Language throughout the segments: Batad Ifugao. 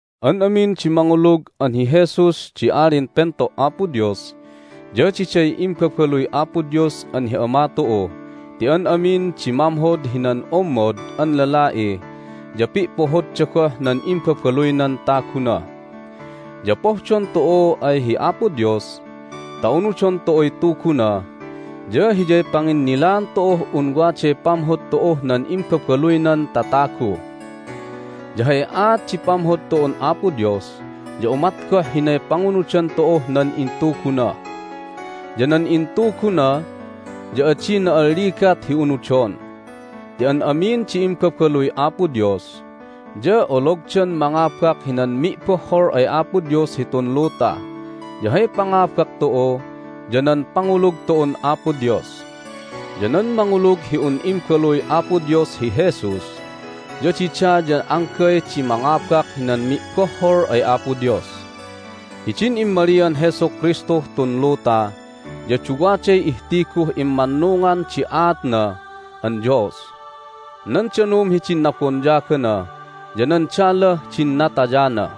An amin di mangulug an hi Jesus di Alin Pento' Apo Dios ya diday imbabaluy Apo Dios an hi Ama tu'u ti an amin di mamhod hinan ommod an lala'i ya pi'pohodda goh nan imbabaluynan taguna. Ya pohdon tu'u ay hi Apo Dios ta unudon tu'uy Tuguna ya hiyay panginnilaan tu'uh un waday pamhod tu'uh nan imbabaluynan tatagu. Ya hay aat di pamhod tu'un Apo Dios ya umat goh hinay pangunudan tu'uh nan intuguna. Ya nan intuguna ya adi na'alligat hi unudon ti an amin di imbabaluy Apo Dios ya ologdan mangabak hinan mi'bohhol ay Apo Dios hitun luta. Ya hay pangabak tu'u ya nan pangulug tu'un Apo Dios. Ya nan mangulug hi un Imbaluy Apo Dios hi Jesus ya dida ya anggay di mangabak hinan mi'bohhol ay Apo Dios. Hidin immalian Jesu Kristuh tun luta ya duwaday ihtiguh immannungan di aatna an Dios: nan danum hidin nabonyagana, ya nan dalah din natayana.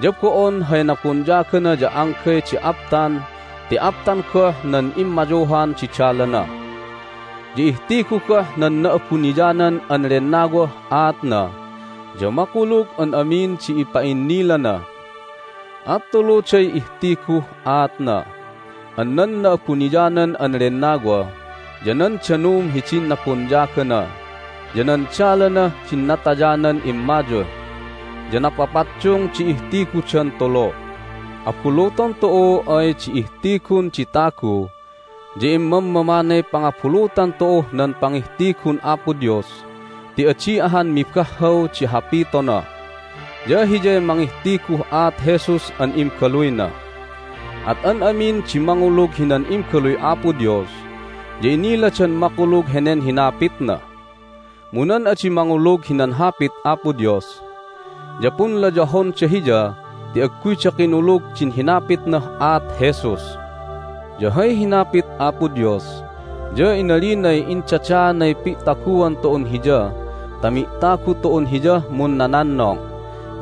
Ya bo'on hay nabonyagana ya anggay di aptan ti aptan goh nan immayuhan di dalana. Ya ihtigu goh nan Na'abuniyanan an Lennawah aatna, ya makulug an amin di ipa'innilana. At tuluday ihtiguh aatna an nan Na'abuniyanan an Lennawa, ya nan danum hidin nabonyagana, ya nan dalanah din natayanan immayuh. Ya napapaddung di ihtigudan tulu! Abuluton tu'u ay di ihtigun di tagu ya imammamanay pangabulutan tu'uh nan pangihtigun Apo Dios ti adi ahan mibahhaw di hapitona! Ya Hiyay mangihtiguh aat Jesus an Imbaluyna. At an amin di mangulug hinan Imbaluy Apo Dios ya iniladan makulug henen hinapitna. Mu nan adi mangulug hinan Hapit Apo Dios ya punlayahonda Hiya ti agguyda kinulug din hinapitnah aat Jesus. Ya hay hinapit Apo Dios ya inalinay indadaanay pi'taguan tu'un Hiya ta mi'tagu tu'un Hiyah munnanannong,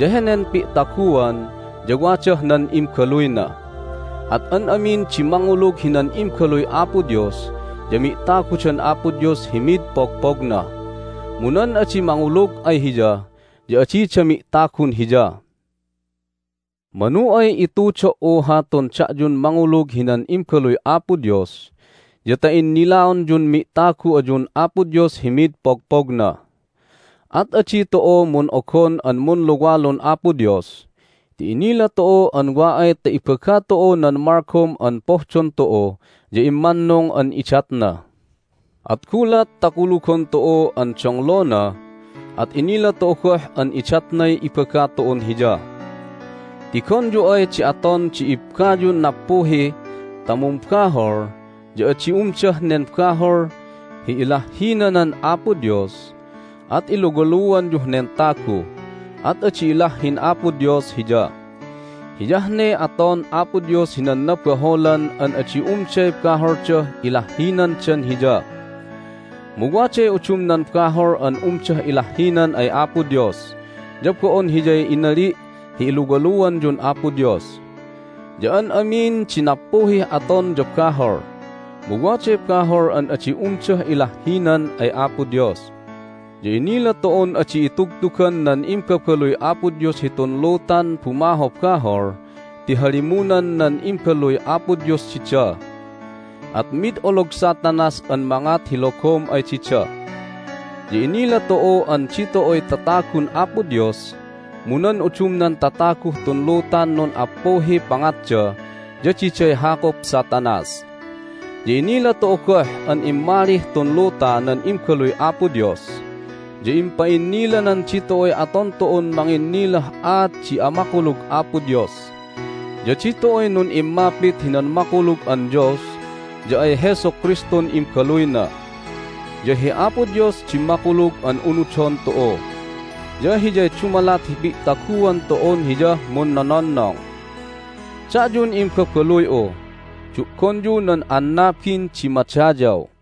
ya henen pi'taguan ya wadah nan Imbaluyna. At an amin di mangulug hinan Imbaluy Apo Dios ya mi'tagudan Apo Dios hi mid pogpogna, mu nan adi mangulug ay Hiya ya adida mi'tagun Hiya. Manu ay itudo"u hatun da'yun mangulug hinan Imbaluy Apo Dios ya ta innilaonyun mi'tagu ayun Apo Dios hi mid pogpogna. At adi tu'u mun'ogon an munluwalun Apo Dios ti inila tu'u an wa ay ta ibaga tu'u nan malgom an pohdon tu'u ya immannung an idatna. At gulat ta kulugon tu'u an donglona at inila tu'u goh an idatnay ibaga tu'un Hiya. Tigonyu ay di aton di ibbayun nappuhi ta mumbahol ya adi umdah nen bahol hi ilahhinanan Apo Dios at iluwaluanyuh nen tagu, at adi ilahhin Apo Dios hiya. Hiyah ne aton Apo Dios hinan nabaholan an adi umday baholdah ilahhinandan Hiya. (Mu waday udumnan bahol an umdah ilahhinan ay Apo Dios, ya bo'on hiyay inali' hi iluwaluanyun Apo Dios.) Ya an amin di nappuhih aton ya bahol, mu waday bahol an adi umdah ilahhinan ay Apo Dios. Ya inila tu'un adi itugtugan nan imbabaluy Apo Dios hitun lutan bumahobahol ti halimunan nan Imbaluy Apo Dios dida, at mid olog Satanas an mangat hi logom ay dida. Ya inila tu'u an ditu'uy tatagun Apo Dios, mu nan udumnan tataguh tun lutan nun'appuhiy pangatda ya diday hakup Satanas. Ya inila tu'u goh an immalih tun luta nan Imbaluy Apo Dios, ya impa'innilanan ditu'uy aton tu'un manginnilah aat di amakulug Apo Dios. Ya ditu'uy nun'immapit hinan makulug an Dios ya ay Jesu Kristun Imbaluyna. Ya hi Apo Dios di makulug an unudon tu'u, ya Hiyay dumalat hi pi'taguan tu'un Hiyah munnononnong. Da'yun imbabaluy'u, du'gonyu nan annabin di madayaw!